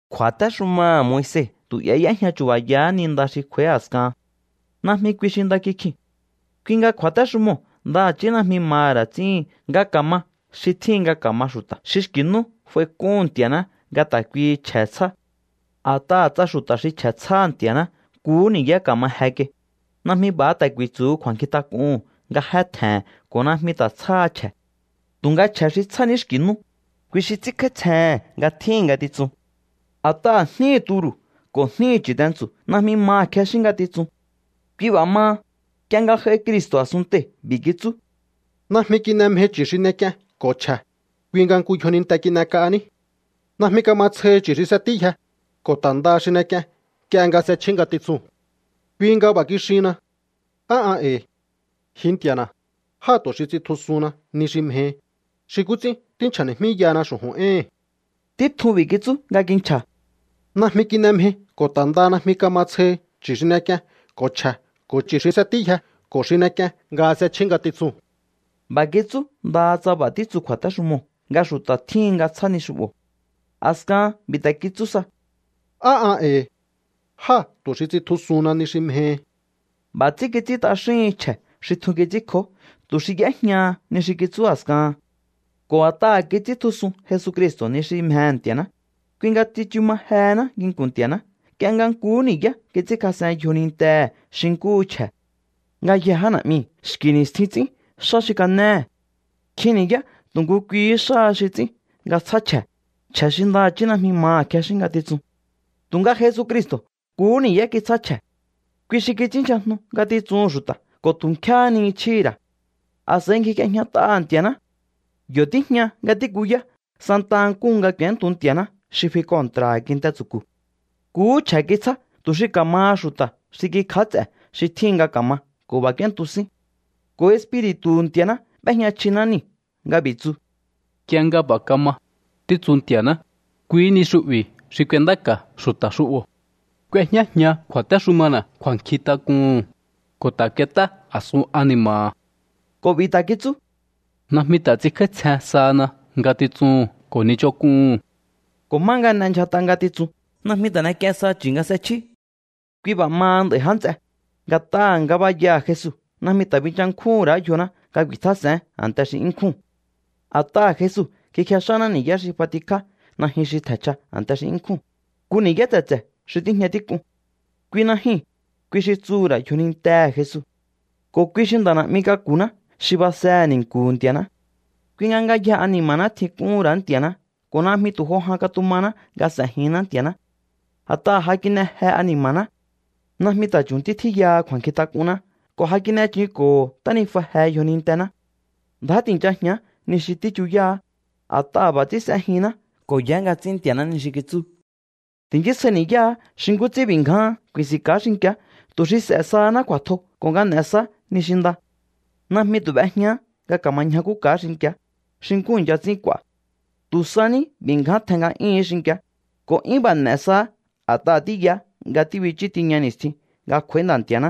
Kju̱a̱téxumaha̱ Moise tu 'ya y'éjña chu̱ba̱yahá ni nda xi kj'u̱a̱í a̱skahan. Najmi kui xi nda kikjiu̱n. Kui nga kju̱a̱téxumoo̱ ndaha̱chí najmi maha̱ ra̱ ts'íhin nga ka̱ma xi tjíhin nga ka̱ma xu̱ta̱ xi xki̱ nú f'aik'úhu̱n Nti̱a̱ná nga ta̱ kuihi chje̱ tsjá. A̱t'aha̱ tsa xu̱ta̱ xi chje̱ tsjáha̱ Nti̱a̱ná nkuhú ni̱yá ka̱ma je kai, najmi b'a̱ ta̱ ku̱i̱tsu̱hu kju̱a̱nkjintak'uhu̱n nga jé tje̱he̱n ko̱ najmi ta̱ tsjáha chje̱. Tu̱nga chje̱ xi tsjá ní xki̱ nú, kui xi ts'ínkj'áítsjehe̱n nga tjíhi̱n ngatitsun. A̱t'aha̱ jníhi̱ turu̱ ko̱ jníhi̱ chu̱tentsu̱ najmi maha̱ kjexín ngatitsuu̱n. Kui b'a̱ maha, nk'ie nga j'aihi Cristo̱ a̱sunntee̱, b'i̱ kitsú: Najmi kin'e mjei chu̱ xi n'ek'ien ko̱ chje̱, kui nga nku yjoninte kin'ek'ahaní. Najmi kama tsjohi chu̱ xi s'etíyje, ko̱ ta̱ ndaha xi n'ek'ien nk'ie nga s'echjí ngatitsuu̱n. Kui nga b'a̱ kixihinna: “Á an e̱i̱. Ji Nti̱a̱na̱, jáa̱ tu̱ xi ts'intjusuhunna ni xi mjehi, xi nkú ts'ín tínchja̱ni̱jmíyahana xu̱ju̱n éhi̱n.” Títjun b'i̱ kitsú nga kinchja̱: “Najmi kin'e mjei ko̱ ta̱ ndaha najmi kama tsjohi chu̱ xi n'ek'ien ko̱ chje̱ ko̱ chu̱ xi s'etíyje ko̱ xi n'ek'ien nga s'echjí ngatitsuu̱n.” B'a̱ kitsú ndaha tsa b'a̱ títsu kju̱a̱téxumoo̱ nga xu̱ta̱ tjíhin nga tsjá ni xu'bo̱. A̱skahan b'i̱ ta̱ kitsú sa: “Á an e̱i̱. Jáa̱ tu̱ xi ts'intjusuhunna ni xi mjehi.” B'a̱ ts'ín kits'ín t'axíhin chje̱ xi tjun kits'ínkjó tu̱ xi y'éjñaha ni xi kitsú a̱skahan. Ko̱ a̱t'aha̱ kits'íntjusun Jesucristo̱ ni xi mjehe̱ Nti̱a̱ná, kui nga tsichu ma jehená nginku̱n Nti̱a̱ná nk'ie nga nkuhú ni̱yá kits'ínkjas'en yjonintehe̱ xi nkúhu chje̱. Ngayjee̱ já na̱'miu̱ xki̱ ni̱stjin ts'ín xá xi kanéhe̱. Nkjin ni̱yá tu̱ nku kuihí xáha xi ts'ín nga tsjá chje̱, chje̱ xi ndaha̱chí najmi maha̱ kjexín ngatitsun. Tu̱nga Jesucristo̱ nkuhú ni̱yá kitsjá chje̱. Kui xi kits'ínndyjajnu ngatitsuhu̱n xu̱ta̱ ko̱ tu̱ nkjéhé ni chjíhi̱ ra̱. A̱s'a̱i ngjik'iejñat'aha̱ Nti̱a̱ná. Yo̱ tíjña nga tíkuyá santa nkúhu nga k'u̱éntu Nti̱a̱ná xi fi kontra̱ha̱ kinte tsu̱ku̱. Nkuhú chje̱ kitsjá tu̱ xi ka̱maha xu̱ta̱ xi kíkj'áts'e̱ xi tjíhin nga ka̱ma ko̱ b'a̱ k'úéntu sín. Ko̱ Espiri̱tu̱hu̱ Nti̱a̱ná b'éjña chjiná niu̱ nga b'i̱ tsu: Nk'ie nga b'a̱ kama, títsu Nti̱a̱ná, kuihí ni xu'bi̱ xi k'uendáka̱ xu̱ta̱ xu'bo̱. K'uejñájian kju̱a̱téxumana̱ kju̱a̱nkjint'ak'uhu̱n, ko̱ ta̱ k'uet'á a̱sun ani̱ma̱ha̱. Ko̱ b'i̱ ta̱ kitsú: Najmi ta̱ ts'inkj'áítsjen sahana ngatitsuhu̱n ko̱ ni ch'onk'uhu̱n. Ko̱ má nga n'endyjat'a ngatitsun, najmi ta̱ n'ek'ien saha chu̱ nga s'echjí. Kui b'a̱ maha nd'a̱i̱, já nts'e, nga̱t'aha̱ ngabayaha̱ Jesu najmi ta̱ binchankjúhu̱n ra̱á yjoná nga ku̱i̱tjás'e̱én a̱nte xi 'yún nkjúu̱n. A̱t'aha̱ Jesu kikjex'áná ni̱yá xi f'atikjá najyun xi tje̱nchja a̱nte xi 'yún nkjúu̱n, nku ni̱yá tse̱tse̱ xi tíjña tík'un. Kui najyuu̱n, kui xi tsuhu̱ ra̱ yjonintehe̱ Jesu. Ko̱ kui xi nda̱ na̱'mi k'aku̱ná xi basehe̱ ni̱nku̱hu̱ Nti̱a̱ná. Kui nga ngayjehe ani̱ma̱ná tjink'úhu̱n ra̱á Nti̱a̱ná ko̱ najmi tu̱ jo jan katumaná nga s'e̱jinná Nti̱a̱ná. A̱t'aha̱ ja kin'e je ani̱ma̱ná. Najmi ta̱ chu̱ntí tjíyaha kju̱a̱nkjintak'unná ko̱ ja kin'e chunko̱ho ntánijua je yjonintená. Ndjá ti̱nchajián ni xi tíchuyáá, a̱t'aha̱ b'a̱ ts'ín s'ejinná ko̱ yaá nga ts'ín Nti̱a̱ná ni xi kitsú. Ti̱nchísjai ni̱yáá xi nkú ts'ín b'i̱ ngjáhán ku̱i̱si̱nka̱á xinki̱á tu̱ xi s'e̱ sahaná kju̱a̱tjo ko̱ nga n'e̱ saá ni xi nda. Najmi tu̱ b'ejñaá nga ka̱ma ñjakúka̱á xinki̱á, xi nkú i̱ncha ts'ín k'u̱a̱. Tu̱ sa ní b'i̱ ngján tjen nga'yúhu̱ún xinki̱á, ko̱ 'yún b'a̱ n'e̱ saá a̱t'aha̱ tíyaá nga tíbichú tiña ni̱stjin nga kj'u̱a̱í Nda̱ Nti̱a̱ná.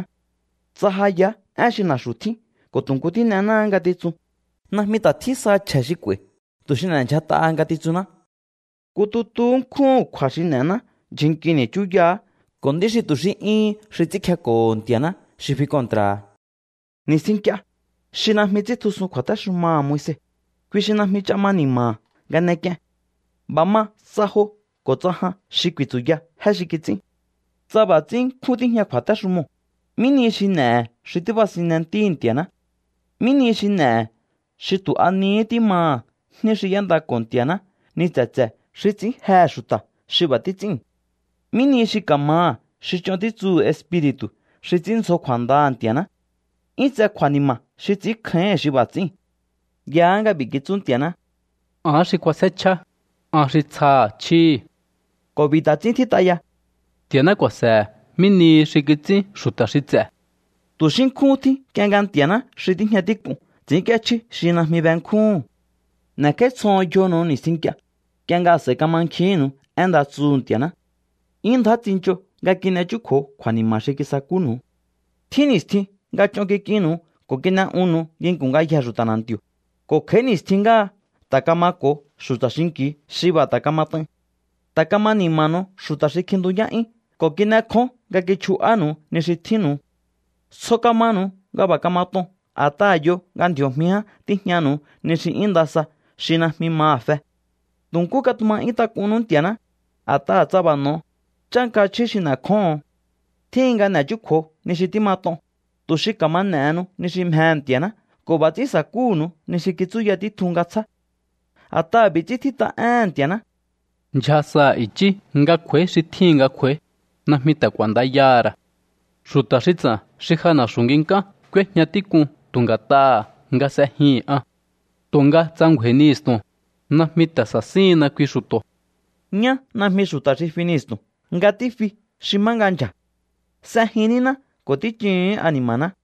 Tsa ja yaá én xi na̱xu̱ tjín ko̱ tu̱ nku tín'enáá ngatitsun, najmi ta̱ tjín saha chje̱ xi k'u̱a̱i̱ tu̱ xi n'e̱ndyjat'aha ngatitsunná. Nku tutuhú nkjúhu̱n kju̱a̱ xi n'e̱ná ndyjun nkini̱ chúyaha̱á ko̱ nd'í xi tu̱ xi 'yúhún xi ts'ínkjeko̱ho Nti̱a̱ná xi fi kontra̱ha̱. Ni̱stjin nk'ie, xi najmi ts'íntjusun kju̱a̱téxumaha̱ Moise, kui xi najmi ch'a ma ni̱ma̱ha̱ nga n'ek'ien. B'a̱ ma tsa jo ko̱ tsa jan xi ku̱i̱tsu̱ya jé xi kits'ín. Tsa b'a̱ ts'ín nkjún tíjña kju̱a̱téxumoo̱, ¿mí ni xi n'e̱he̱ xi tíbasinne Ntíhi̱ Nti̱a̱ná? ¿Mí nihi xi n'e̱he̱ xi tu̱ a nihí tímaha̱ jní xi y'éndako̱ho Nti̱a̱ná ni tse̱tse̱ xi ts'ín jehe̱ xu̱ta̱ xi b'a̱ títs'íu̱n? ¿Mí nihi xi ka̱maha̱ xi ch'on títsuhu̱ Espiri̱tu̱ xi ts'ínndzjo kju̱a̱ndaha̱ Nti̱a̱ná? 'Yún tse kju̱a̱ni̱ma̱ xi ts'i̱ínkjáíhi̱n xi b'a̱ ts'íu̱n. Yaá nga b'i̱ kitsú Nti̱a̱ná: “Ahán xi k'uasjé chjíá, an xi tsjaha̱ chjíhi̱.” Ko̱ b'i̱ ta̱ ts'ín tjít'a ya: “Nti̱a̱ná ku̱a̱se̱he̱ mí nihi xi kits'ín xu̱ta̱ xi ts'e̱.” ¡Tu̱ xí nkjúhún tjín nk'ie nga Nti̱a̱ná xi tíjña tík'uu̱n ts'ínk'íéchjí xi najmi benkjúhu̱n! N'e̱kj'áítsjoho̱on yjonu̱u ni̱stjin nk'ie, nk'ie nga a̱s'a̱i kamankjihínnu̱u én nda tsuhu̱ Nti̱a̱ná. 'Yún ndjá tsincho nga kin'e chúkju̱o kju̱a̱ni̱ma̱ xi kisakúnu̱u. Tjín ni̱stjin nga ch'on kik'innu̱u ko̱ kin'e'unnu̱u nginku̱n ngayjee̱ xu̱ta̱ na̱nti̱o̱, ko̱ kj'a̱í ni̱stjin ngáha ta̱ kamako̱o xu̱ta̱ xinki̱u xi b'a̱ ta̱ kamat'ain. Ta̱ kama ni̱ma̱nu̱u xu̱ta̱ xi kjintuyá'yún ko̱ kin'ekjón nga kichju'ánu̱u ni xi tjínnu̱u. Tsjo kamanu̱u nga b'a̱ kamat'on a̱t'aha̱ yo nga ndji̱o̱jmi ján tíjñanu̱u ni xi 'yún nda sa xi najmi maha̱ fe. Tu̱ nkú katuma 'yún tak'unnú Nti̱a̱ná, a̱t'aha̱ tsa b'a̱ n'o̱o, chánka chjí xi n'e̱kjóho̱on. Tjíhin nga n'e̱ chúkju̱o ni xi tímat'on, tu̱ xi ka̱ma n'e̱henu ni xi mjehe̱ Nti̱a̱ná ko̱ b'a̱ ts'ín sa̱kúhu̱nu̱u ni xi kitsúya títjun nga tsjá. A̱t'aha̱ b'i̱ ts'ín tjít'a éhe̱n Nti̱a̱ná: Ndyja sa i̱chí nga kj'u̱a̱í xi tjíhin nga kj'u̱a̱í, najmi ta̱ k'u̱a̱ndayaha̱ ra̱. Xu̱ta̱ xi ts'a̱n xi ja na̱xu̱ nginkán k'úéjña tík'un tu̱ nga̱t'aha̱ nga s'ejihi̱n an. Tu̱nga tsa ngju̱a̱i̱njihi̱stu̱n, najmi ta̱ sa̱síhinna kui xu̱to̱. Ñá najmi xu̱ta̱ xi finjihi̱stu̱n nga tífi xi má nga ndyja̱. S'ejin níná ko̱ tíchuhu̱ún ani̱ma̱ná.